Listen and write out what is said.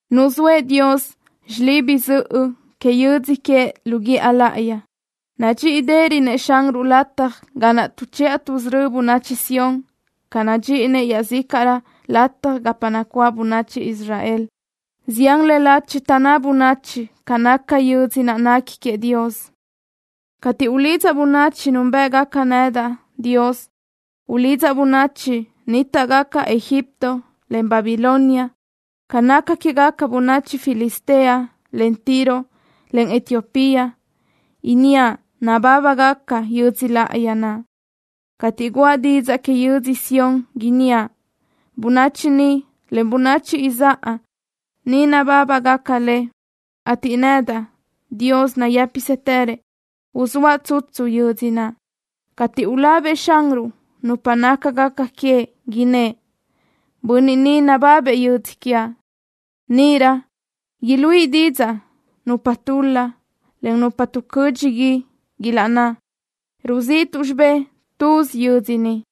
Nuzóëʼ Dios xilibi zöʼö que yödzö queëʼ lu guíʼa láʼayi. Nadxíʼirönëʼ Xanruʼ lataj ga naʼ tuʼchiʼa tuʼsörö́ bönachi Sión ca nadxíʼinëʼ iaʼzícaʼrö lataj gapa nacuáʼ bönachi Israel. Zián le lachi taʼnná bönachi ca naca yödz naʼ nequi queëʼ Dios. Cateʼ ulidzaʼ bönachi núnbëʼgaca nedaʼ, Dios, ulidzaʼ bönachi nnítaʼgaca Egipto, en Babilonia. Ca naca quégaca bönachi Filistea, en Tiro, en Etiopía inníaʼ nabábagaca yödzö láʼayi naʼ. Cateʼ guʼa didzaʼ que yödzö Sión inníaʼ: Bönachi ni, en bönachi izáʼa ni nabábagaca le, ateʼ nedaʼ, Dios nayë́pisëtërëʼ, uzóaʼ tsutsu yödzö naʼ. Cateʼ ulabëʼ Xanruʼ nupa nácagaca queëʼ innë́ʼ: “Bönniʼ ni nababëʼ yödzö quiaʼ.” Níʼirö iluíʼi didzaʼ nupa tul-la, en nupa tuʼcödxi gui, ilaʼná: “Ruzíʼituʼ xibé tuzi yödzö ni.”